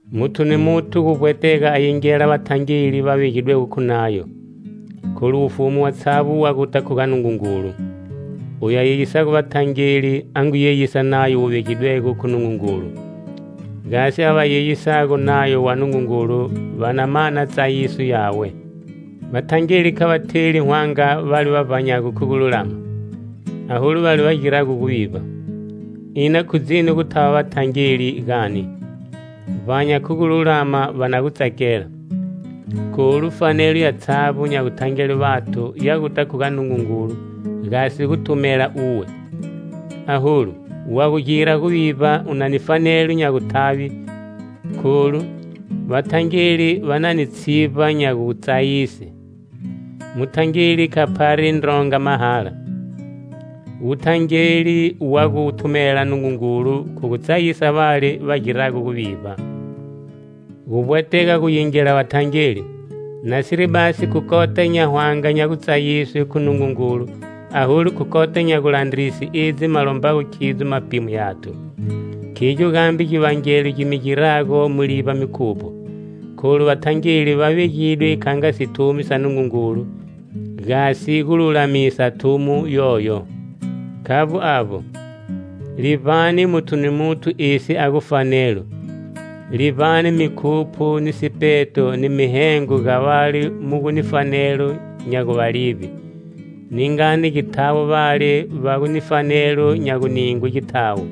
Muthu ni muthu guvbwetega a yingela vathangeli va vegidwego khu nayo, kholu wufumu watshavbo wa guta khu ga Nungungulu. Oyu a yeyisago vathangeli a ngu yeyisa nayo wu vegidwego khu Nungungulu: Gasi ava va yeyisago nayo wa Nungungulu va na mana tsayiso yawe. Vathangeli kha va theli hwanga vale va vbanyago khu gululama, aholu vale va girago guvivba. Ina khu dzini gu thava vathangeli, gani? Vbanya khu gululama, va na gu tsakela. Kholu fanelo yatshavbo nya guthangele vathu ya guta khu ga Nungungulu gasi guthumela uwe. Aholu wa gu gira guvivba u na ni fanelo nya guthave kholu vathangeli va na ni tshivba nya gutsayise. Muthangeli kha phari ndronga mahala. Wuthangeli wa gu thumela Nungungulu khu gu tsayisa vale va girago guvivba. Guvbwetega gu yingela vathangeli, nasiri basi khu kota nya hwanga nya gutsayiswe khu Nungungulu, aholu khu kota nya gulandrise edzi ma lombago khidzo mapimo yathu. Khigyo gambe givangelo gi mi girago mu livba mikhupho, kholu vathangeli va vegidwe kha nga sithumi sa Nungungulu gasi gu lulamisa thumo yoyo. Khavbo avbo, livbani muthu ni muthu esi a gu fanelo. Livbani mikhupho ni sipeto ni mihengo ga vale mu gu ni fanelo nya gu va livbe; ningani githawo vale va gu ni fanelo nya guningwe githawo,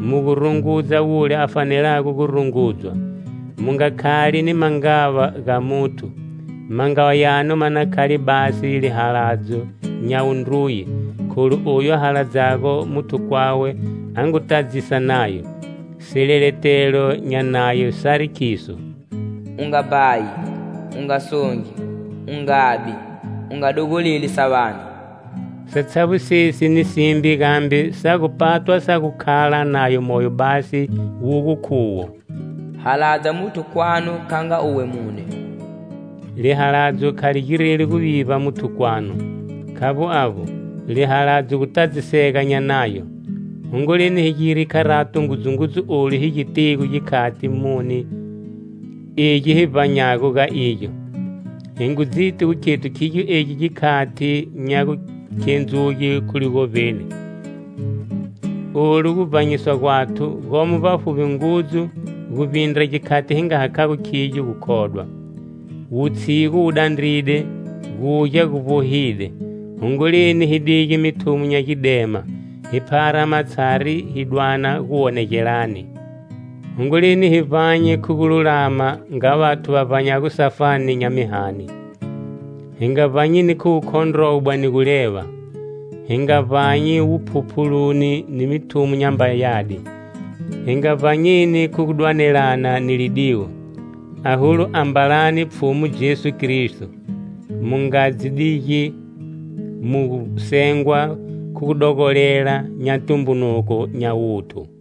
mu gu rungudza wule a fanelago gu rungudzwa. Mu nga khali ni mangava ga muthu. Mangava yanu ma na khale basi lihaladzo nya wundruye. Kholu oyu a haladzago muthu kwawe a ngu tadzisa nayo. Sileletelo nya nayo sari khiso: "U nga bhayi, u nga songi, u ngabi, u nga dogoleli sa vane". Satshavbo sesi ni simbe gambe sa gu patwa sa gu khala nayo moyo basi wu gu khuwo: "Haladza muthu kwanu kha nga uwe mune." Lihaladzo kha li gireli guvivba muthu kwanu. Khavbo avbo, lihaladzo gutadzisege nya nayo. Hongoleni hi gire kharato ngudzungudzu olu hi gitigo, gikhati muni egi hi vbanyago ga igyo. Hi ngu dziti gu khethu khigyo egi gikhati nya gukhendzuge khu ligovbeni. Olu guvbanyiswa gwathu gomo vbafuvbi ngudzu guvbindra gikhati hi nga hakhago khigyo gukhodwa. Wutshigu wu dandride, gugya gu vbohide. Hongoleni hi dige mithumo nya gidema, hi phara matshari hi dwana guwonegelani. Hongoleni hi vbanye khu gululama nga vathu va vbanyago safani nya mihani; hi nga vbanyeni khu wukhondrobwa ni guleva; hi nga vbanyi wuphuphuluni ni mithumo nyamba yadi; hi nga vbanyeni khu gu dwanelana ni lidiwo. Aholu ambalani Pfhumu Jesu Kristo, mu nga dzi digi mu gu sengwa khu gudogolela nya tumbunuko nya wuthu.